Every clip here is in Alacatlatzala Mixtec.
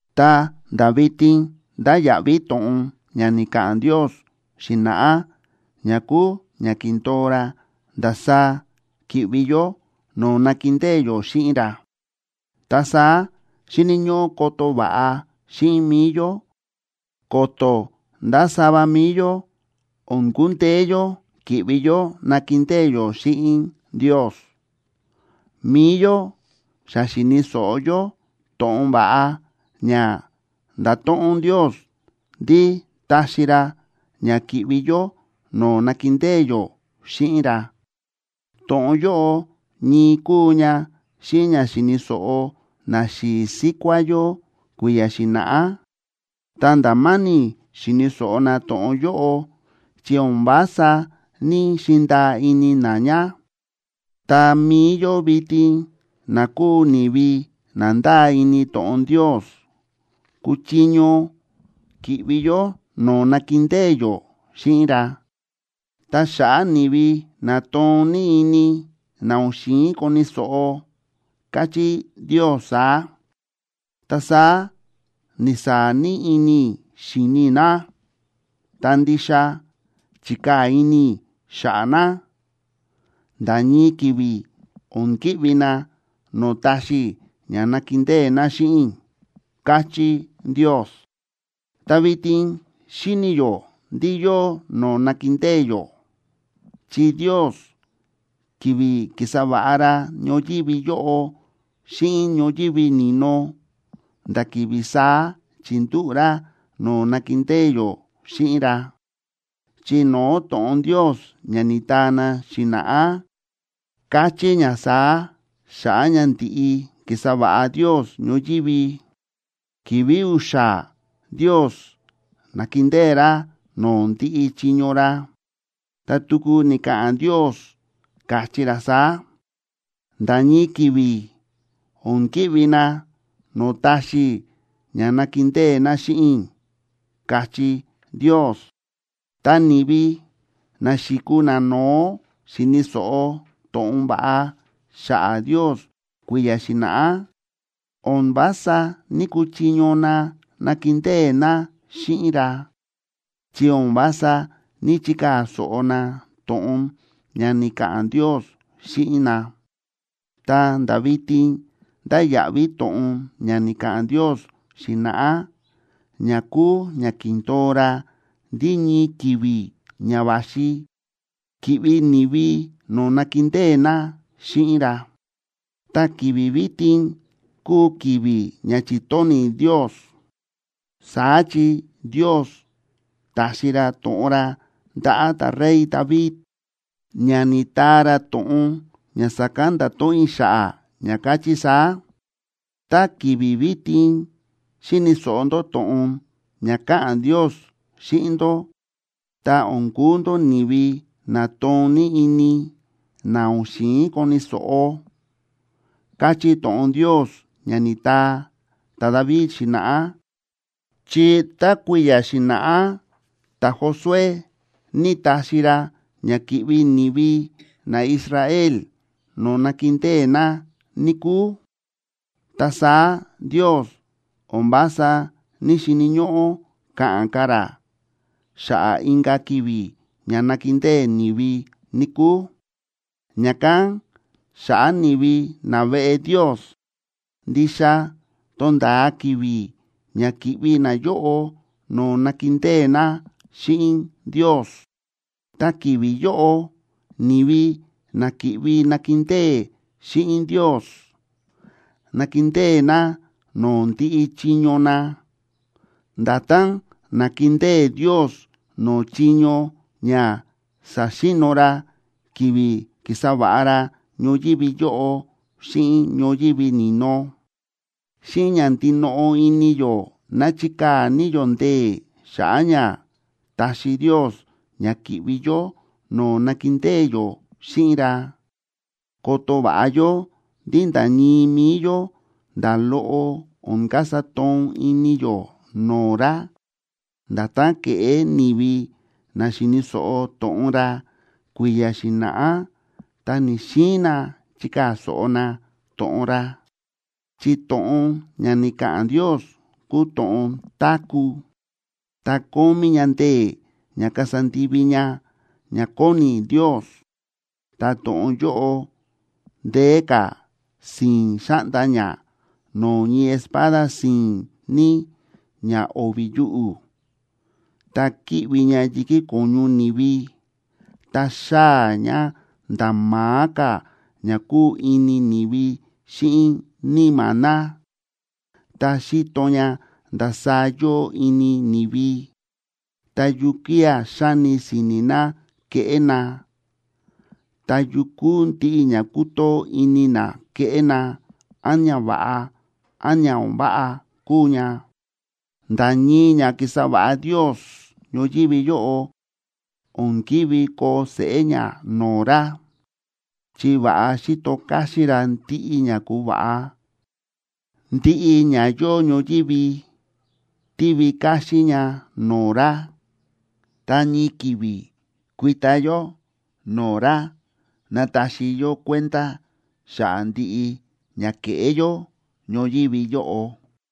Ta nda̱ vitin ndáya̱ꞌví to̱ꞌon ña ni̱ka̱ꞌa̱n Ndios xi̱na̱ꞌá ña kúu ña ki̱ndo̱o ra ndasaá ki̱ꞌvi yó no̱o̱ nakindée yó xíꞌin ra, ta saá xíni̱ ñóꞌó koto va̱ꞌa xíꞌin mi̱i yó ko̱to̱ nda̱ sava mi̱i yó o̱n kundeé yó ki̱ꞌvi yó nakindée yó xíꞌin Ndios. Mi̱i yó xa xi̱ni̱ so̱ꞌo yó to̱ꞌon va̱ꞌa ña nda̱to̱ꞌon Ndios ndí taxi ra ña ki̱ꞌvi yó no̱o̱ nakindée yó xíꞌin ra. To̱ꞌon yóꞌo ñii kúu ña xíꞌin ña xi̱ni̱ so̱ꞌo naxi̱i̱ síkuá yó kui̱ya̱ xi̱na̱ꞌá. Ta nda̱ ma̱ni̱ xi̱ni̱ so̱ꞌo na to̱ꞌon yóꞌo, chi o̱n vása ní‑xindaa ini na ña. Ta mi̱i yó vitin na kúu ni̱vi na ndáa ini to̱ꞌon Ndios, kúchiño ki̱ꞌvi yó no̱o̱ nakindée yó xíꞌin ra, ta xa̱ꞌa̱ ni̱vi na toon ní ini, na o̱n xi̱in koni̱ so̱ꞌo, káchí Ndios saá: Ta saá ni̱saa̱ ní ini i̱ xi̱ni i̱ na, ta ndixa chi̱kaa̱ ini i̱ xa̱ꞌa̱ na: “Nda̱ ñii ki̱vi̱, o̱n ki̱ꞌvi na no̱o̱ taxi i̱ ña nakindée na xíꞌin i̱”, káchí Ndios. Ta vitin xíni̱ yó ndí yóo no̱o̱ nakindée yó, chi Ndios, ki̱vi̱ ki̱sa va̱ꞌa ra ñoyívi yóꞌo xíꞌin ñoyívi ni̱no, nda̱ ki̱vi̱ saá chi̱ndúꞌu̱ ra no̱o̱ nakindée yó xíꞌin ra. Chi no̱o̱ to̱ꞌon Ndios ña ni̱taa na xi̱na̱ꞌá, káchí ña saá xa̱ꞌa̱ ña ndi̱ꞌi ki̱sa va̱ꞌa Ndios ñoyívi: Ki̱vi̱ u̱xa̱ Ndios na̱kindée ra no̱o̱ ndiꞌi chiño ra. Ta tuku ni̱ka̱ꞌa̱n Ndios, káchí ra saá: “Nda̱ ñii ki̱vi̱, o̱n ki̱ꞌvi na no̱o̱ taxi i̱ ña nakindée na xíꞌin i̱”, káchí Ndios. Ta ni̱vi na xi̱kuu nano̱ó xi̱ni̱ so̱ꞌo to̱ꞌon va̱ꞌa xa̱ꞌa̱ Ndios kui̱ya̱ xi̱na̱ꞌá, o̱n vása ní‑kuchiño na nakindée na xíꞌin ra, chi o̱n vása ní‑chikaa̱ so̱ꞌo na to̱ꞌon ña ni̱ka̱ꞌa̱n Ndios xíꞌin na. Ta nda̱ vitin ndáya̱ꞌví to̱ꞌon ña ni̱ka̱ꞌa̱n Ndios xi̱na̱ꞌá, ña kúu ña ki̱ndo̱o ra ndí ñii ki̱vi̱ ña va̱xi ki̱ꞌvi ni̱vi no̱o̱ nakindée na xíꞌin ra. Ta ki̱vi̱ vitin kúu ki̱vi̱ ña chi̱tóni̱ Ndios. Saá chi Ndios ta̱xi ra to̱ꞌon ra ndaꞌa̱ ta̱rey David, ña ni̱taa ra to̱ꞌon ña sa̱kán nda̱to̱ꞌon i̱ xa̱ꞌa̱, ña káchí saá: Tá ki̱vi̱ vitin xíni̱ so̱ꞌo ndó to̱ꞌon ña káꞌa̱n Ndios xíꞌin ndó, ta o̱n kuu ndó ni̱vi na toon ní ini, na o̱n xi̱in koni̱ so̱ꞌo, káchí to̱ꞌon Ndios ña ni̱taa ta̱David xi̱na̱ꞌá. Chi tá kui̱ya̱ xi̱na̱ꞌá ta̱Josué ní ta̱xi ra ña ki̱ꞌvi ni̱vi naIsrael no̱o̱ nakindée na, níkúu, ta saá Ndios o̱n vása ní‑xini̱ ñóꞌó ka̱ꞌa̱n ka̱ ra xa̱ꞌa̱ inka̱ ki̱vi̱ ña nakindée ni̱vi, níkúu. Ña̱kán xa̱ꞌa̱ ni̱vi naveꞌe Ndios, ndixa tonda̱a ki̱vi̱ ña ki̱ꞌvi nayóꞌo no̱o̱ nakindée na xíꞌin Ndios. Ta ki̱vi̱ yóꞌo, ni̱vi na ki̱ꞌvi nakindée xíꞌin Ndios, nakindée na no̱o̱ ndiꞌi chiño na, nda̱tán na̱kindée Ndios no̱o̱ chiño ña sa̱xi̱no̱ ra, ki̱vi̱ ki̱sa va̱ꞌa ra ñoyívi yóꞌo xíꞌin ñoyívi ni̱no. Xíꞌin ña ndinoꞌo ini yó ná chikaa̱ ní yó ndee̱ xa̱ꞌa̱ ña taxi Ndios ña ki̱ꞌvi yó no̱o̱ nakindée yó xíꞌin ra. Koto va̱ꞌa yó ndí nda̱ ñii mi̱i yó nda̱ loꞌo o̱n kasa toon ini yó no̱o̱ ra, nda̱tán ke̱ꞌé ni̱vi na xi̱ni̱ so̱ꞌo to̱ꞌon ra kui̱ya̱ xi̱na̱ꞌá ta ni̱‑xiin na chikaa̱ so̱ꞌo na to̱ꞌon ra. Chi to̱ꞌon ña ni̱ka̱ꞌa̱n Ndios kúu to̱ꞌon táku̱, ta kómí ña ndee̱ ña kasa ndivi ña ña kóni Ndios. Ta to̱ꞌon yóꞌo ndeé ka̱ si̱i̱n xáꞌnda ña no̱o̱ ñii espada si̱i̱n ní ña o̱vi̱ yuꞌu̱. Ta kíꞌvi ña yi̱kí ko̱ñu ni̱vi, ta xáa̱ ña nda̱ ma̱á ka̱ ña kúu ini ni̱vi xíꞌin níma̱ na. Ta xíto ña ndasaá yóo ini ni̱vi, ta yukía̱ xáni si̱ni̱ na keꞌé na, ta yu kúu ndiꞌi ña kútoo ini na keꞌé na, án ña va̱ꞌa, án ña o̱n váꞌa kúu ña. Nda̱ ñii ña ki̱sa va̱ꞌa Ndios ñoyívi yóꞌo o̱n ki̱ví koo seꞌé ña no̱o̱ ra, chi va̱ꞌa xíto káxín ra ndiꞌi ña ku̱va̱ꞌa. Ndiꞌi ña yóo ñoyívi tívi káxín ña no̱o̱ ra, ta ñii ki̱vi̱ kuita yó no̱o̱ ra nataxi yó kuenda xa̱ꞌa̱ ndiꞌi ña ke̱ꞌé yó ñoyívi yóꞌo.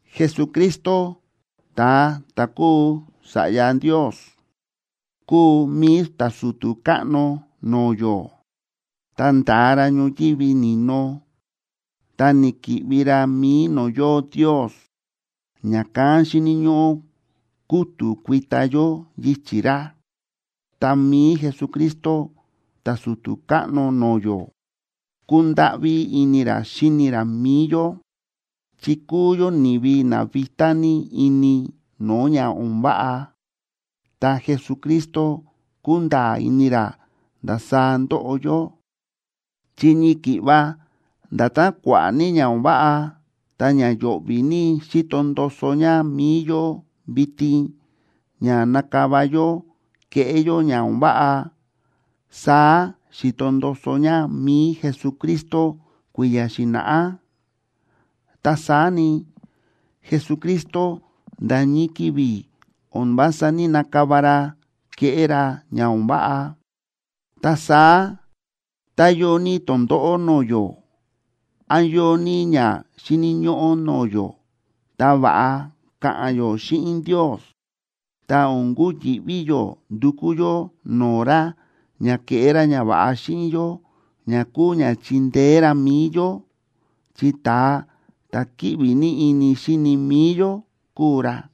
Jesucristo ta̱a ta̱ kúu Sa̱ꞌya Ndios, kúu mi̱i ta̱su̱tu̱ káꞌno no̱o̱ yó, ta nda̱a ra ñoyívi ni̱no ta ni̱ki̱ꞌvi ra mi̱i no̱o̱ yóo Ndios. Ña̱kán xíni̱ ñóꞌó kútu̱ kuita yó yichi̱ ra. Ta mi̱i Jesucristo ta̱su̱tu̱ káꞌno no̱o̱ yó, kúndáꞌví ini ra xíni ra mi̱i yó, chi kúu yó ni̱vi na vitá ní ini no̱o̱ ña o̱n váꞌa. Ta Jesucristo kúnda̱a̱ ini ra ndasaá ndóꞌo yó, chi ñii ki̱ꞌva nda̱tán kua̱ꞌa̱ ní ña o̱n váꞌa ta ña yo̱ꞌvi̱ ní xíto ndoso ña mi̱i yó vitin ña nakava yó keꞌé yó ña o̱n váꞌa, saá xi̱to ndoso ña mi̱i Jesucristo kui̱ya̱ xi̱na̱ꞌá. Ta saá ni, Jesucristo nda̱ ñii ki̱vi̱ o̱n vása ní‑nakava ra keꞌé ra ña o̱n váꞌa. Ta saá tá yóo ní tondóꞌó no̱o̱ yó, án yóo ní ña xíni̱ ñóꞌó no̱o̱ yó, ta va̱ꞌa ka̱ꞌa̱n yó xíꞌin Ndios, ta o̱n kuyi̱ꞌví yó ndukú yó no̱o̱ ra ña keꞌé ra ñava̱ꞌa xíꞌin yó ña kúu ña chindeé ra mi̱i yó, chi ta̱a ta̱ kíꞌvi ní ini xíni mi̱i yó kúu ra.